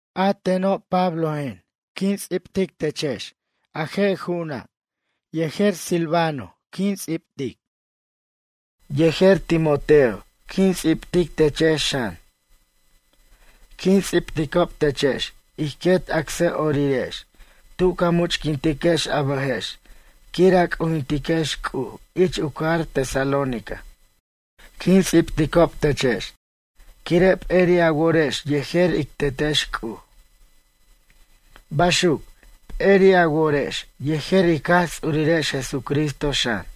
A teno', Pablojen, quin ts'ibtic techex a je' ju'una' yejer Silvano quin ts'ibtic. Yejer Timoteo quin ts'ibtic techex xan. Quin ts'ibticob techex ij quet acsʌ'orirex tu ca much'quintiquex a bʌjex quir a c'ujintiquex C'uj ich u cajar Tesalónica. Quin ts'ibticob techex quire' p'eri' a worex yejer ic Tetex C'uj. Baxuc, p'eri' a worex yejer ic Jaj Ts'urirex Jesucristo xan.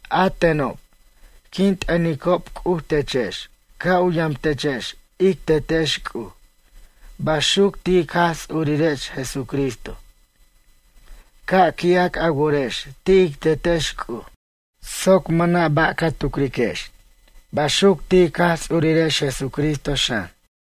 A tenob, quin t'ʌnicob C'uj techex ca' u yamtechex ic Tetex C'uj. Baxuc ti' ic Jaj Ts'urirex Jesucristo. Ca' qui'ac a worex ti' ic Tetex C'uj soc mʌna' ba' ca tucriquex. Baxuc ti' ic Jaj Ts'urirex Jesucristo, xan.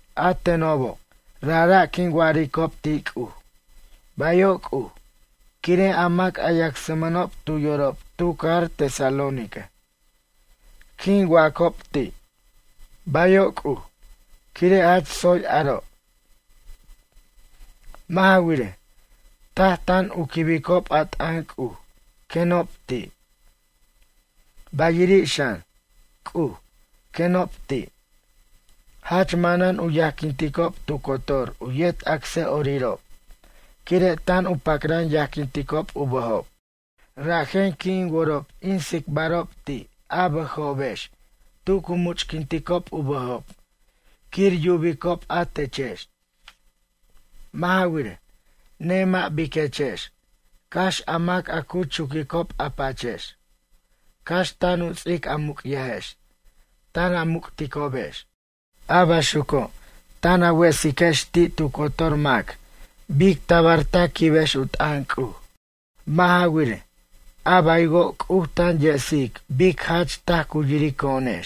A tenobo' rajra' quin wa'aricob ti' C'uj: “Bayo' C'uj” quire' a mac a yacsmʌnob tu yorob tu cajar Tesalónica. Quin wacob ti': Bayo' C'uj, quire' jach tsoy aro'. Mʌ' ja wirej, taj tan u quibicob a t'ʌn C'uj, quenob ti'. Bayiri' xan, C'uj, quenob ti'. Jach manan u yajquinticob tu cotor u yet acsʌ'orirob quire' tan u pacran yajquinticob u bʌjob. Rajen qui' in worob in tsicbarob ti' a bʌjobex tu cu much'quinticob u bʌjob quir yubicob a techex. Mʌ' ja wirej, nemʌ' biquechex cax a mac a cu chuquicob a pachex. Cax tan u ts'ic a muc'yajex tan a muc'ticobex. A baxuco' tan a wesiquex ti' tu cotor mac bic tabar ta quibex u t'ʌn C'uj. Mʌ' ja wirej, a baywo' C'uj tan yesic bic jach taj cu yirico'onex.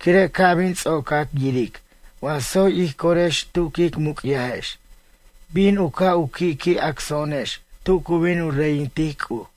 Quire' ca' bin ts'ocac yiric wa tsoy ij corex tu quic muc'yajex bin u ca' u qui' qui' acso'onex tu cu bin u reyintic C'uj.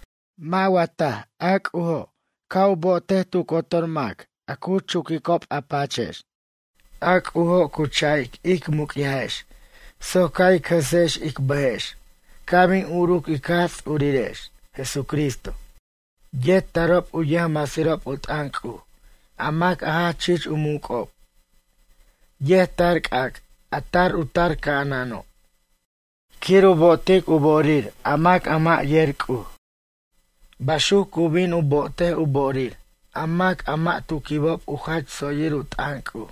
Mʌ' wa taj a C'ujo' ca' u bo'otej tu cotor mac a cu chuquicob a pachex? A C'ujo' cu ch'a'ic ic muc'yajex soc ca' ic jesex ic bʌjex ca' bin uruc ic Jaj Ts'urirex, Jesucristo. Yet tarob u yʌjmasirob u t'ʌn C'uj a mac a jach chich u muc'ob. Yet tar c'ac', a tar u tar ca'anano'. Quir u bo'otic u bo'orir a mac a mʌ' yer C'uj. Baxuc cu bin u bo'otej u bo'orir a mac a mʌ' tu quibob u jach tsoyir u t'ʌn C'uj.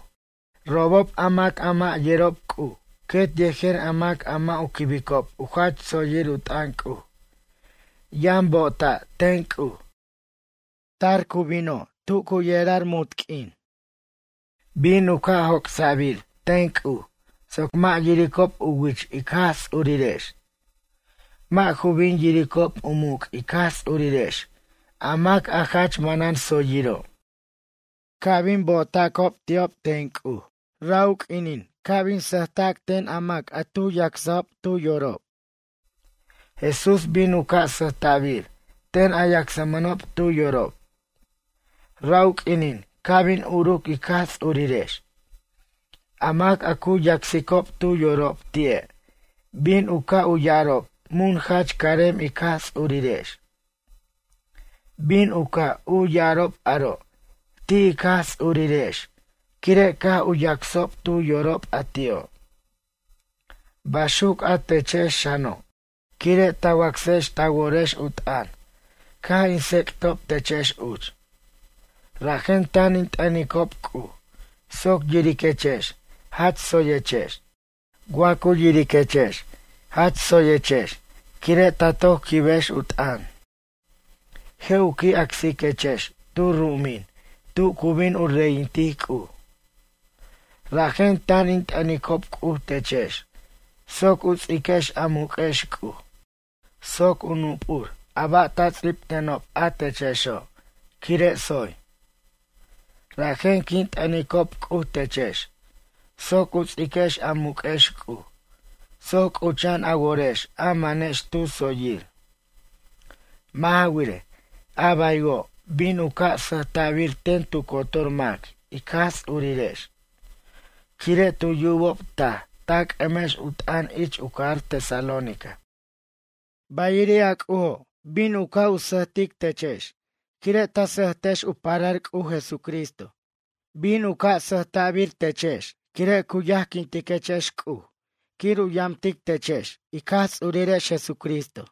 Robob a mac a mʌ' yerob C'uj quet yejer a mac a mʌ' u quibob u jach tsoyir u t'ʌn C'uj, yʌn bo'ota' ten C'uj. Tar bino' cu yerar munt q'uin. Bin u ca' joc'sa'bir ten C'uj soc mʌ' yiricob u wich ic Jaj Ts'urirex. Mʌ' ju bin yiricob u muc' ic Jaj Ts'urirex a mac a jach manan tsoyiro'. Ca' bin u bo'otacob ti'ob ten C'uj ra' u q'uinin ca' bin sʌjta'bir ten a mac tu yacsajob tu yorob. Jesús bin u ca' sʌjta'bir ten a yacsmʌnob tu yorob. Ra' u q'uinin ca' bin uruc ic Jaj Ts'urirex. A mac a cu yacsicob tu yorob ti'e' bin u ca' u ya'arob mun jach carem ic Jaj Ts'urirex. Bin u ca' u ya'arob aro' ti' ic Jaj Ts'urirex quire' caj u yacsob tu yorob a ti'o'. Baxuc a techex xano' quire' ta wacsex ta worex u t'ʌn caj in tsec'tob techex uch. Rajen tan in t'ʌnicob C'uj soc yiriquechex jach tsoyechex. Wa cu yiriquechex jach tsoyechex quire' ta toc quibex u t'ʌn. Je' u qui' acsiquechex tu ru'umin tu cu bin u reyintic C'uj. Rajen tan in t'ʌnicob C'uj techex soc u ts'iquex a muq'uex C'uj. Soc u nup'ur a ba' ta ts'ibtenob a techexo' quire' tsoy. Rajen quin t'ʌnicob C'uj techex soc u ts'iquex a muq'uex C'uj soc c'ucha'an a worex a manex tu tsoyir. Mʌ' ja wirej, a baywo' bin u ca' sʌjta'bir ten tu cotor mac ic Jaj Ts'urirex, quire' tu yubob taj ta c'ʌmex u t'ʌn ich u cajar Tesalónica. Bayiri' a C'ujo', bin u ca' u sʌjbensirtic techex, quire' ta sʌjtex u parar C'uj Jesucristo. Bin u ca' u sʌjbensirbir techex quire' cu yajquintiquechex C'uj quir u yamtic techex ic Jaj Ts'urirex Jesucristo.